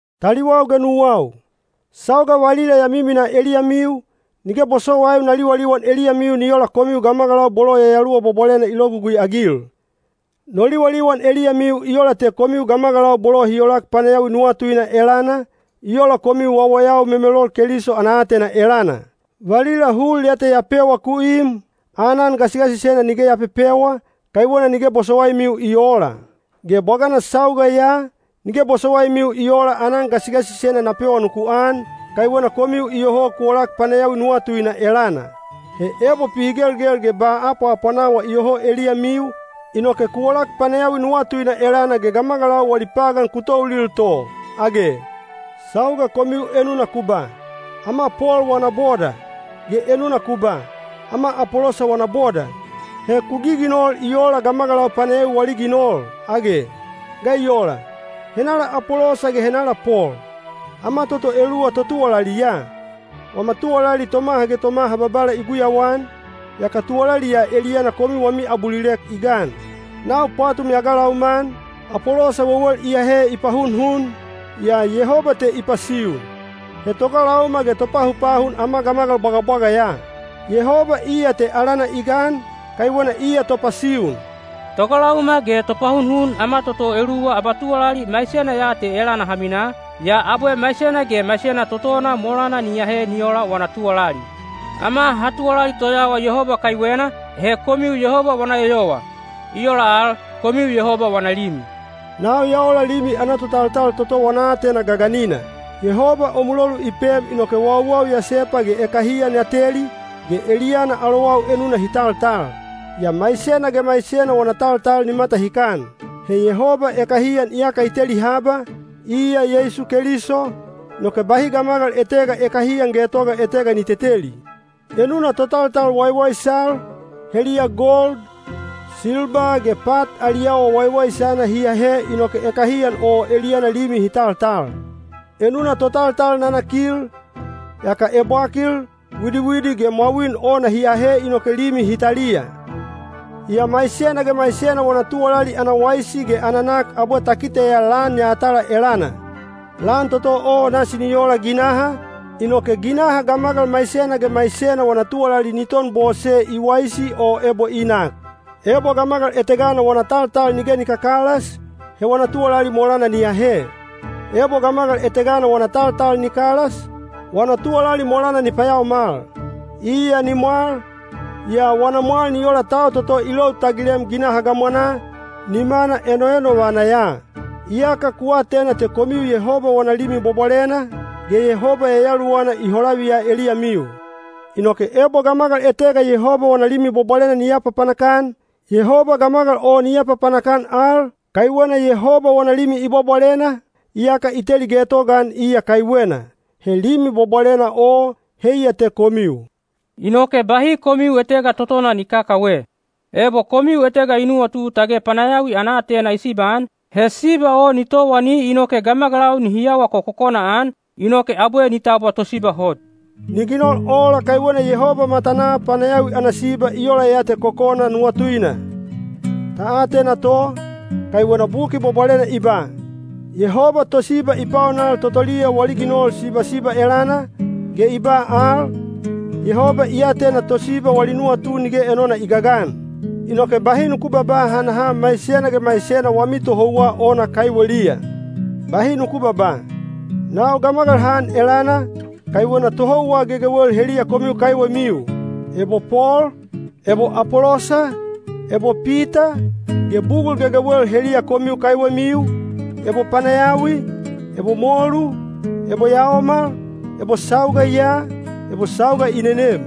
Taliwau ge nuwau, sauga valila ya miminaa eliyamiu, nige bosowaiu na liwaliwan eliyamiu ni ola komiu gamagalau bolo Yayaluwa Bwabwalena i logugui-agil. No liwaliwan eliyamiu i ola te komiu gamagalau bolo hi olak panayawi nuwatuina elana, i ola komiu wawayau memelol Keliso ana aatena elana. Valila hul ya te ya pewa ku im, aanan gasigasisena nige ya pepewa, kaiwena nige bosowaimiu i oola. Ge bwagana sauga ya, nige bosowaimiu i oola aanan gasigasisena na pewa nuku an, kaiwena komiu iyoho ku olak panayawi nuwatuina elana. He ebo pihigelgel ge ba apwaapwanawa iyoho eliyamiu, inoke ku olak panayawi nuwatuina elana ge gamagalau wali pagan ku toulil to, age? Sauga komiu enuna ku ba, “Ama Pol wana boda,” ge enuna ku ba, “Ama Apolosa wana boda,” he ku giginol i oola gamagalau panayawi wali ginol, age? Ga i ola? Henala Apolosa ge henala Pol? Ama toto eluwa totuwalali ya. Wama tuwalali tomaha ge tomaha Babala i guyauan, yaka tuwalali ya eliyana komiu wami abulilek i gan. Nau pwatum ya galauma-an, Apolosa wewel i ahe i pahunhun, yaa Yehoba te i pasiun. He togalauma ge topahunhun ama gamagal bwagabwaga ya. Yehoba iya te alana i gan, kaiwena iya topasiun. Togalauma ge topahunhun ama toto eluwa abatuwalali maisena ya te elana ha minaa, yaa abwe maisena ge maisena totona molana ni ahe ni ola wana tuwalali. Ama ha tuwalali toyawa Yehoba kaiwena, he komiu Yehoba wana eyowa. I ola al, komiu Yehoba wana limi. Nau ya ola limi ana totaltal toto wana aatena gaganina. Yehoba o mulolu i pem inoke wauwau ya sepa ge ekahiyan ya teli, ge eliyana alowau enuna hi taltal. Yaa maisena ge maisena wana taltal ni matahikan. He Yehoba ekahiyan iyaka i teli haba, iya Yeisu Keliso, inoke bahi gamagal etega ekahiyan getoga etega ni teteli. Enuna totaltal waiwaisal, heliya gold, silba ge pat ali awa waiwaisana hi ahe inoke ekahiyan o eliyana limi hi taltal. Enuna totaltal nanakil, yaka ebwakil, widiwidi ge mwawin ona hi ahe inoke limi hi taliya. Yaa maisena ge maisena wana tuwalali ana waisi ge ana nak abwe ta kiteya lan yatala elana. Lan toto o nasi ni ola ginaha, inoke ginaha gamagal maisena ge maisena wana tuwalali ni ton bose i waisi o ebo i nak. Ebo gamagal etegana wana taltal nige ni kakalas, he wana tuwalali molana ni ahe. Ebo gamagal etegana wana taltal ni kalas, wana tuwalali molana ni payaomal. Iya ni mwal, yaa wana mwal ni ola tau toto i lou tagilem ginaha gamwanaa, nimana enoenovana ya. Iyaka ku atena te komiu Yehoba wana Limi Bwabwalena, ge Yehoba Yayaluwana i holaviya eliyamiu. Inoke ebo gamagal etega Yehoba wana Limi Bwabwalena ni apapanak-an, Yehoba gamagal o ni apapanak-an al, kaiwena Yehoba wana limi i bwabwalena, iyaka i teli getogaan iya kaiwena. He Limi Bwabwalena o, heiya te komiu. Inoke bahi komiu etega totona ni kakawe. Ebo komiu etega i nuwatu tage panayawi ana aatena i sibaan, he siba o ni towani inoke gamagalau nihi awa kokokona-an, inoke abwe ni tabwa tosiba hot. Ni ginol ola kaiwena Yehoba matanaa panayawi ana siba i ola ya te kokona nuwatuina. Ta atena to, kaiwena Buki Bwabwalena i ba, “Yehoba tosiba i paonal totoliya wali ginol sibasiba elana”, ge i ba al, “Yehoba i atena tosiba wali nuwatu nige enona i gagan.” Inoke bahi nuku babaa hanaha maisena ge maisena wami tohouwa ona kaiweliya. Bahi nuku babaa, “Nau gamagal han elana,” kaiwena tohouwa gegewel heliya komiu kaiwemiu—ebo Pol, ebo Apolosa, ebo Pita—ge bugul gegewel heliya komiu kaiwemiu—ebo panayawi, ebo molu, ebo yaomal, ebo sauga ya, ebo sauga i nenem.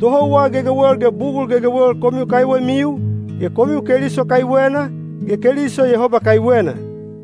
Tohouwa gegewel ge bugul gegewel komiu kaiwemiu, ge komiu Keliso kaiwena, ge Keliso Yehoba kaiwena.